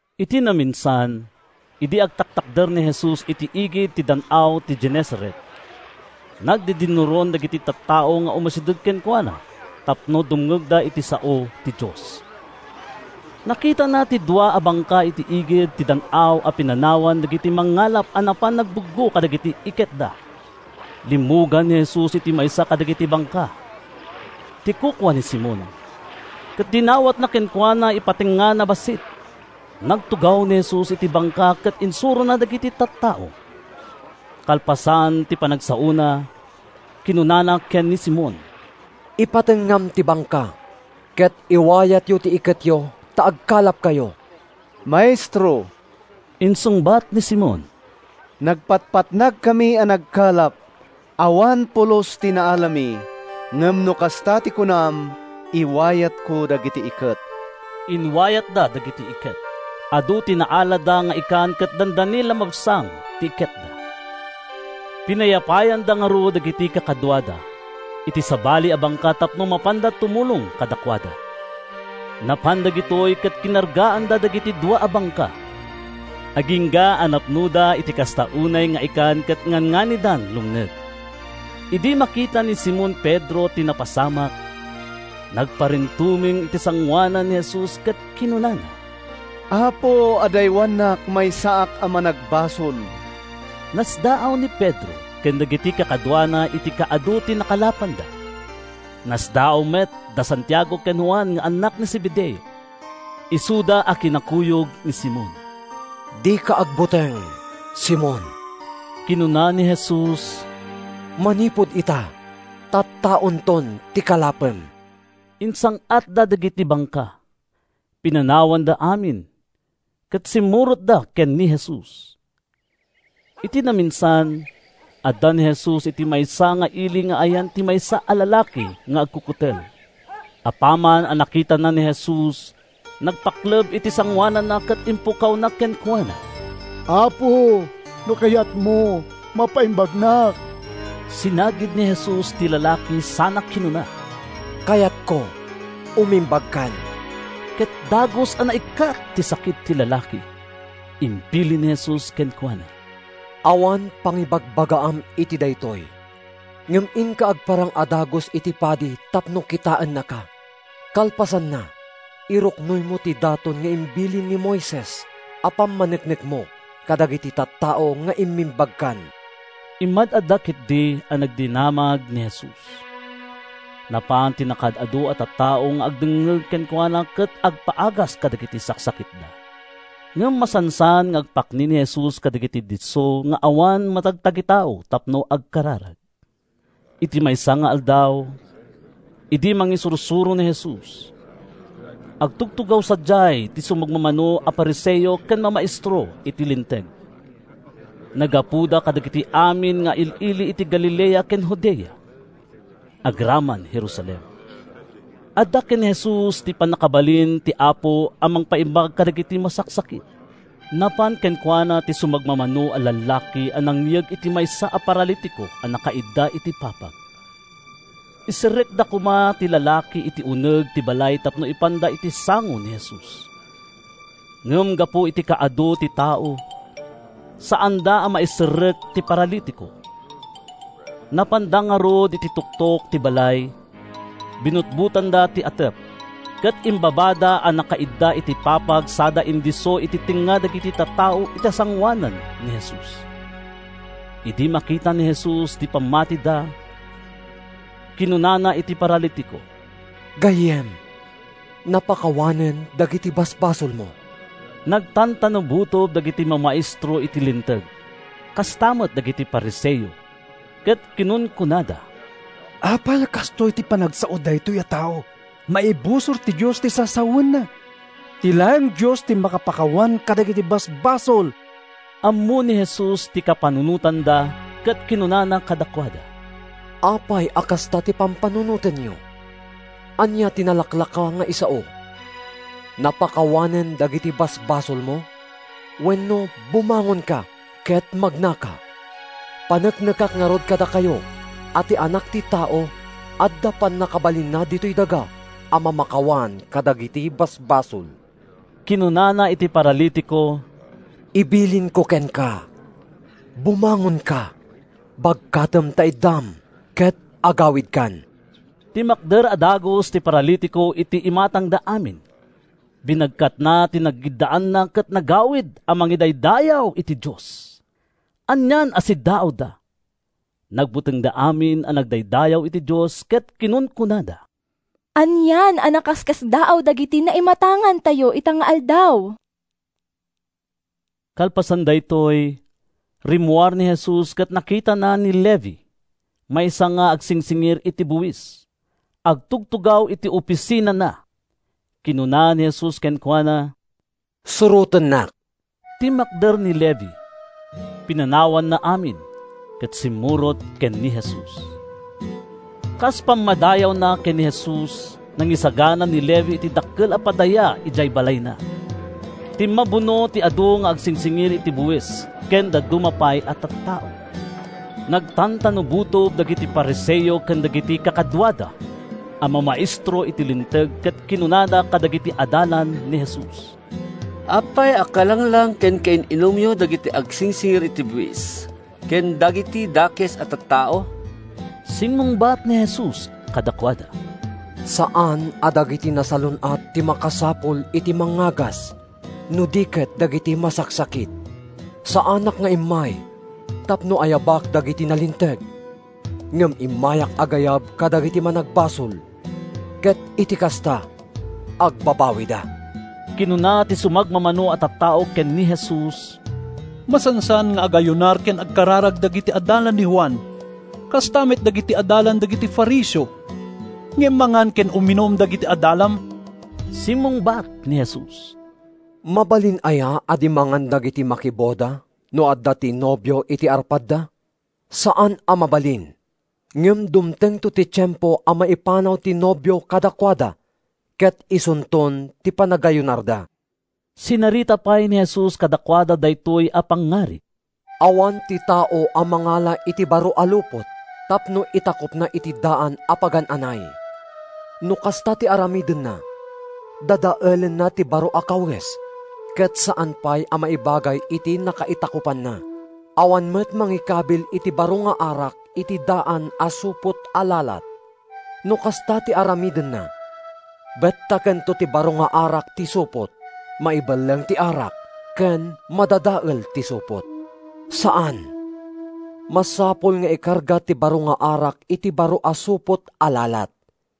Iti naminsan, idi agtaktakder ni Jesus iti igid ti Dan-aw ti Genesaret, nagdidinnuron dagiti tattao nga umasideg kenkuana tapno dumngegda iti sao ti Dios. Nakitana ti dua a bangka iti igid ti dan-aw a pinanawan dagiti mangngalap a napan nangbuggo kadagiti iketda. Limmugan ni Jesus iti maysa kadagiti bangka, ti kukua ni Simon, ket dinawatna kenkuana ipatengngana bassit. Nagtugaw ni Jesus iti bangka ket insurona dagiti tattao. Kalpasan ti panagsaona, kinunana ken ni Simon: “Ipatengngam ti bangka, ket iwayatyo ti iketyo ta agkalapkayo.” “Maestro,” insungbat ni Simon, “nagpatpatnagkami a nagkalap. Awan pulos ti naalami. Ngem no kasta ti kunam, iwayatko dagiti iket.” Inwayatda dagiti iket. Adu ti naalada nga ikan ket dandani la mabsang ti iketda. Pinayapayanda ngarud dagiti kakaduada iti sabali a bangka tapno mapanda tumulong kadakuada. Napan dagitoy ket kinargaanda dagiti dua a bangka agingga a napnoda iti kasta unay nga ikan ket ngannganidan lumned. Idi makita ni Simon Pedro ti napasamak, nagparintumeng iti sangoanan ni Jesus ket kinunana, “Apo, adaywannak! Maysaak a managbasol.” Nasdaaw ni Pedro ken dagiti kakaduana iti kaadu ti nakalapanda. Nasdaaw met da Santiago ken Juan nga annak ni Zebedeo, isuda a kinakuyog ni Simon. “Dika agbuteng, Simon,” kinuna ni Jesus, “manipud ita, tattaonton ti kalapem.” Insang-atda dagiti bangka, pinanawanda amin, ket simmurotda ken ni Jesus. Iti naminsan, adda ni Jesus iti maysa nga ili nga ayan ti maysa a lalaki nga agkukutel. Apaman a nakitana ni Jesus, nagpakleb iti sangoananna ket impukkawna kenkuana, “Apo, no kayatmo, mapaimbagnak.” Sinagid ni Jesus ti lalaki sana kinuna, “Kayatko! Umimbagkan.” Ket dagus a naikkat ti sakit ti lalaki. Imbilin ni Jesus kenkuana: “Awan pangibagbagaam iti daytoy, ngem inka agparang a dagus iti padi tapno kitaennaka. Kalpasanna, iruknoymo ti daton nga imbilin ni Moises a pammaneknekmo kadagiti tattao nga immimbagkan.” Immad-adda ketdi a nagdinamag ni Jesus. Napan ti nakaad-adu a tattao nga agdengngeg kenkuana ken agpaagas kadagiti saksakitda. Ngem masansan nga agpakni ni Jesus kadagiti disso nga awan matagtagitao tapno agkararag. Iti maysa nga aldaw, idi mangisursuro ni Jesus, agtutugaw sadiay ti sumagmamano a Fariseo ken mamaestro iti Linteg. Naggapuda kadagiti amin nga il-ili iti Galilea ken Judea, agraman Jerusalem. Adda ken ni Jesus ti pannakabalin ti Apo a mangpaimbag kadagiti masaksakit. Napan kenkuana ti sumagmamano a lallaki a nangyeg iti maysa a paralitiko a nakaidda iti papag. Iserrekda koma ti lalaki iti uneg ti balay tapno ipanda iti sango ni Jesus. Ngem gapu iti kaadu ti tao, saanda a maiserrek ti paralitiko. Napanda ngarud iti tuktok ti balay, binutbotanda ti atep, ket imbabada a nakaidda iti papag sada indisso iti tengnga dagiti tattao iti sangoanan ni Jesus. Idi makita ni Jesus ti pammatida, kinunana iti paralitiko, “Gayyem, napakawanen dagiti basbasolmo.” Nagtantanabutob dagiti mamaestro iti Linteg, kasta met dagiti Fariseo, ket kinunkunada: “Apay a kastoy ti panagsao daytoy a tao? Maibusor iti Dios ti sasawenna! Ti laeng Dios ti makapakawan kadagiti basbasol!” Ammo ni Jesus ti kapanunotanda ket kinunana kadakuada, “Apay a kasta ti pampanunotenyo? Ania ti nalaklaka nga isao: ‘Napakawanen dagiti basbasolmo’ wenno ‘Bumangonka ket magnaka’? Paneknekak ngarud kadakayo a ti Anak ti Tao adda pannakabalinna ditoy daga a mamakawan kadagiti basbasol.” Kinunana iti paralitiko, “Ibilinko kenka: bumangonka, bagkatem ta iddam, ket agawidkan!” Timmakder a dagus ti paralitiko iti imatangda amin, binagkatna ti nagiddaanna ket nagawid a mangidaydayaw iti Dios. Anian a siddaawda! Nagbutengda amin a nagdaydayaw iti Dios ket kinunkunada, “Anian a nakaskasdaaw dagiti naimatangantayo ita nga aldaw!” Kalpasan daytoy, rimmuar ni Jesus ket nakitana ni Levi, maysa nga agsingsingir iti buis. Agtugtugaw iti ofisinana. Kinuna ni Jesus kenkuana, “Surotennak.” Timmakder ni Levi, pinanawanna amin, ket simmurot ken ni Jesus. Kas pammadayawna ken ni Jesus, nangisagana ni Levi iti dakkel a padaya idiay balayna. Timmabuno ti adu nga agsingsingir iti buis ken dadduma pay a tattao. Nagtantanabutob dagiti Fariseo ken dagiti kakaduada a mamaestro iti Linteg ket kinunada kadagiti adalan ni Jesus, “Apay a kalanglang ken kain-inumyo dagiti agsingsingir iti buis ken dagiti dakes a tattao?” Simmungbat ni Jesus kadakuada: “Saan a dagiti nasalun-at ti makasapul iti mangngagas no di ket dagiti masaksakit. Saanak nga immay tapno ayabak dagiti nalinteg ngem immayak agayab kadagiti managbasol ket iti kasta agbabawida.” Kinuna ti sumagmamano a tattao ken ni Jesus: “Masansan nga agayunar ken agkararag dagiti adalan ni Juan, kasta met dagiti adalan dagiti Fariseo; ngem mangan ken uminum dagiti adalam.” Simmungbat ni Jesus: “Mabalin aya a di mangan dagiti makiboda no adda ti nobio iti arpadda? Saan a mabalin! Ngem dumtengto ti tiempo a maipanaw ti nobio kadakuada ket isunton ti panagayunarda.” Sinarita pay ni Jesus kadakuada daytoy a pangngarig: “Awan ti tao a mangala iti baro a lupot tapno itakupna iti daan a pagan-anay. No kasta ti aramidenna, dadaelenna ti baro a kawes ket saan pay a maibagay iti nakaitakupanna. Awan met mangikabil iti baro nga arak iti daan a supot a lalat. No kasta ti aramidenna, bettakento ti baro nga arak ti supot, maibelleng ti arak ken madadael ti supot. Saan! Masapul nga ikarga ti baro nga arak iti baro a supot a lalat.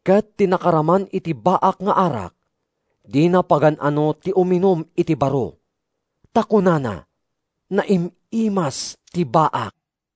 Ket ti nakaraman iti baak nga arak, dina pagan-ano ti uminum iti baro. Ta kunana: ‘Naim-imas ti baak.’”